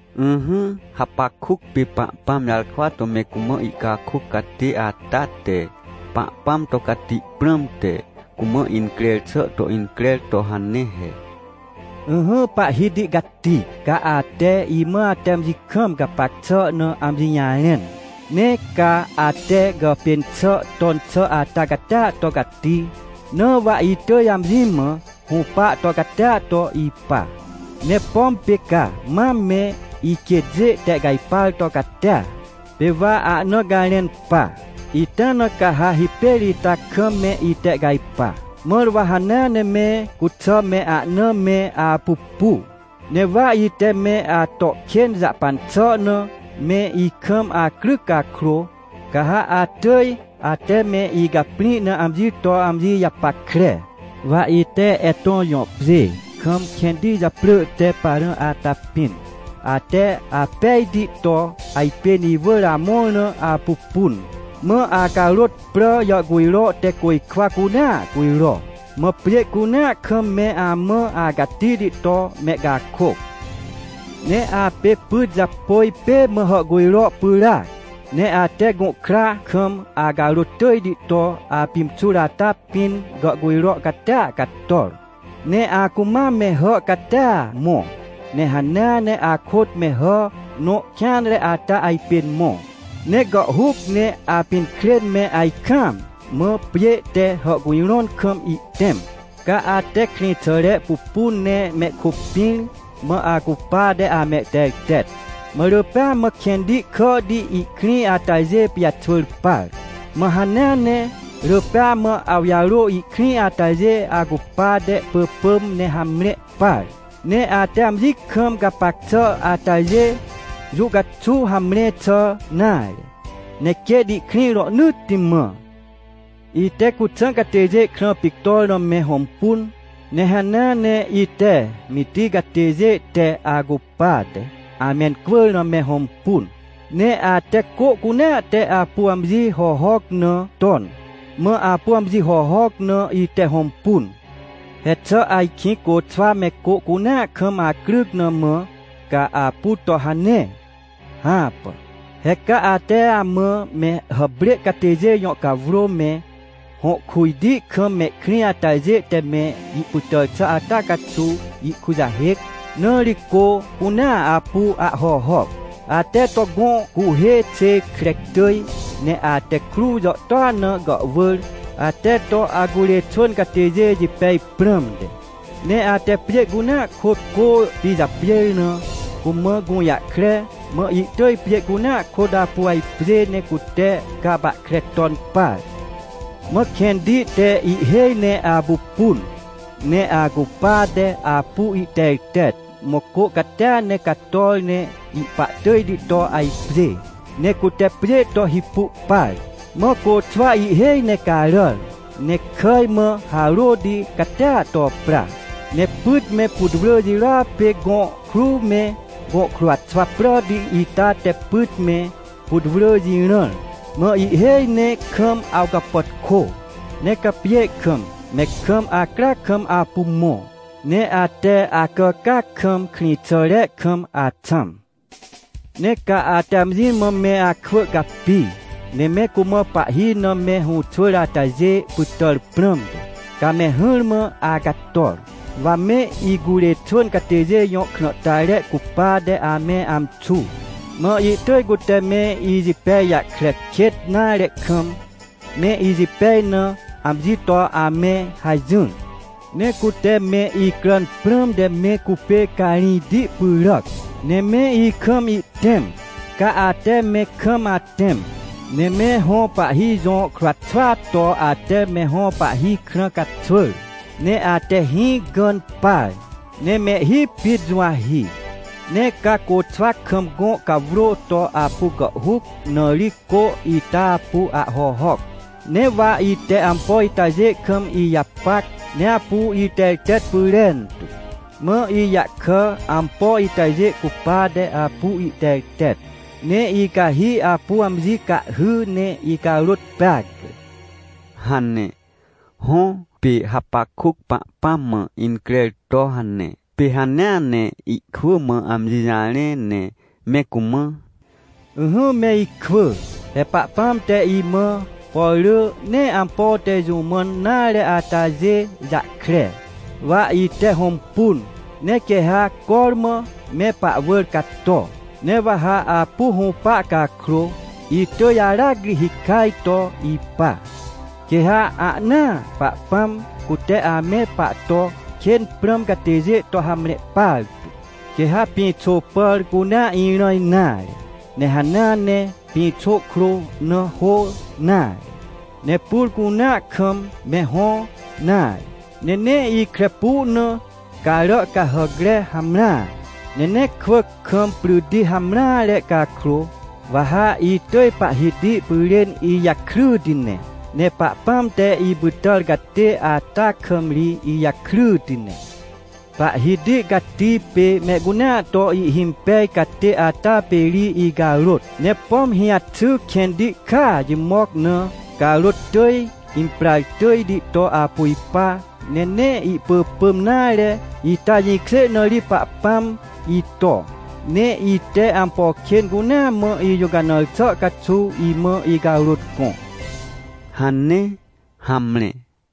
Ỹhỹ, Hapakuc pê Pahpãm jarkwa to me cumã ihcakôc catê ata te Pahpãm to cati prãmte, cumã increr xà to increr to hane he: “Ỹhỹ Pahhiti Cati, ca ate imã ate amji kam gapac xà na amji jarẽn. Ne ca ate gàpên xà ton xà ata catia to cati, na wa itỳj amji mã hũpa to catia to ipa. Ne pom pê ca mam me iquêtjê tehcajpar to catia, pê wa ahna garẽn pa, ita na ca ha hipêr ita kam me itehcajpa, mãr wa hanea ne me cuxà me ahna me apupu. Ne wa ite me ato kên jahpan xà na me ikam acryc cakrô, ca ha atỳj ate me icaprĩ na amji to amji japackre. “Wa ite Etõ jõ pjê kam kẽnti japrỳ te Parã ata pĩn, ate apejti to ajpên iwỳr amõr na apupun. Mã acarôt prà jàhcujro te côjkwa cunea cujro. Mã pjê cunea kam me amã acatihti to mehcakôc. Ne apê pyt japôj pê mã hàhcujro pyràac, ne ate gũhkra kam acarôt tỳjti to apimxur ata pĩn gàhcujro catia cator. Ne acumam me hà catia mõ, ne hanea ne akôt me hà nõ kêanre ata ajpên mõ. Ne gàhhuc ne apinkrên me ajkaam mã pjê te hàhcujrõn kam ihtẽm. Ca ate krĩxàre pupun ne mehkôpĩr, mã acupate amehtertet. Mã rỳ pêa mã kẽnti kàhti ihkrĩ atajê pijaxwỳr par. Mã hanea ne rỳ pêa mã awjarô ihkrĩ atajê acupate pỳpỳm ne hamre par. Ne ate amji kam gapac xà atajê, jũ caxuw hamre xà nare, ne quêt ihkrĩ rohnỳtti mã. “Ite Cuxã catêjê krã pictor na me hõmpun. Ne hanea ne ite Mitij catêjê te acupate amencwỳr na me hõmpun. Ne ate cô cunea te apu amji hohoc na ton, mã apu amji hohoc na ite hõmpun. He xà ajkĩ côxwa me cô cunea kam acryc na mã, ca apu to hane? Hãpà! He ca ate amã me hàprê catêjê jõ cawrô me, hõ kujti kam mehkrĩ atajê te me ipytàr xà ata caxuw ihkujahêc, na ri cô cunea apu ahhohoc. Ate to gõ cuhê xê kre tỳj, ne ate kruw jàhtôa na gàhwỳr, ate to acurê xwỳn catêjê jipej prãmte. Ne ate pjê cunea kôt cô pijapjêr na cumã gũjahkre, mã ihtỳj pjê cunea kôt apu ajpjê ne cute capahkre ton par. Mã kẽnti te ihhêj ne apupun, ne acupate apu ihtertet, mã cô catia ne cator ne ihpahtỳjti to ajpjê, ne cute pjê to hipu par. Mã côxwa ihhêj ne caràr, ne kàj mã harôti catia to pra. “Ne pyt me putwrỳ jirôa pê gõ kruw me, gõ kruwxwa pràti ita te pyt me, putwrỳ jirãr, mã ihhêj ne kam awcapàtkô. Ne ca pjê kam, me kam acryac kam apu mõ, ne ate acàcàac kam, krĩxàre kam axãm. “Ne ca ate amji mã me akwỳ capi, ne me cumã pahhi na me hũxwỳr atajê pytàr prãmte, ca me hỹrmã acator. Wa me icurê xwỳn catêjê jõ krãhtare cupate ame amxu. Mã ihtỳj cute me ijipej jahkre kêt nare kam, me ijipej na amji to ame hajỹr. Ne cute me icràn prãmte me cupê carĩjti pyràc, ne me ikam ihtẽm. Ca ate me kam atẽm, ne me hõ pahhi jõ kruw xwaa to ate me hõ pahhi krã caxwỳr. Ne ate hĩ gãn par, ne mehhi pit juwahi. Ne ca côxwa kam gõ cawrô to apu gàhhuc, na ri cô ita apu ahhohoc. “Ne wa ite ampo itajê kam ijapac, ne apu itertet pyrentu. Mã ijahkà ampo itajê cupate apu ihtertet, ne icahi apu amji cahhy ne icarôt peacre” hane. Hõ, pê Hapakuc Pahpãm mã increr to hane. Pê hanea ne ihkwỳ mã amji jarẽ ne me cumã: “Ỹhỹ me ikwỳ! He Pahpãm te imã, por rỳ nee ampo te jũ mãn nare atajê jahkre, wa ite hõmpun, ne quê ha cormã me pahwỳr cato. Ne wa ha apu hũpa cakrô, itỳj aracri hikaj to ipa, quê ha ahnaa Pahpãm, cute ame pahto kên prãm catêjê to hamre partu. “Quê ha pĩxô pàr cunea irã nare, ne hanea ne pĩxô krô na hô nare, ne pur cunea kam me hõ nare, ne nee ikre pu na carà cahàcre hamreare, ne nee kwỳc kam pryti hamreare cakrô, wa ha itỳj Pahhiti pyrên ijakryti ne. Ne Pahpãm te ipytàr catê ata kam ri ijakryti ne. Pahhiti Cati pê mehcunea to ihhimpej catê ata pê ri icarôt. Ne pom hĩjaxy kẽnti kàa jimoc na, carôt tỳj imprar tỳjti to apu ipa, ne nee ihpỳpỳm nare, ita jĩkjê na ri Pahpãm ito, ne ite ampo kên cunea mã ijũcanãr xà caxuw imã icarôt gõ” hane. Hamre.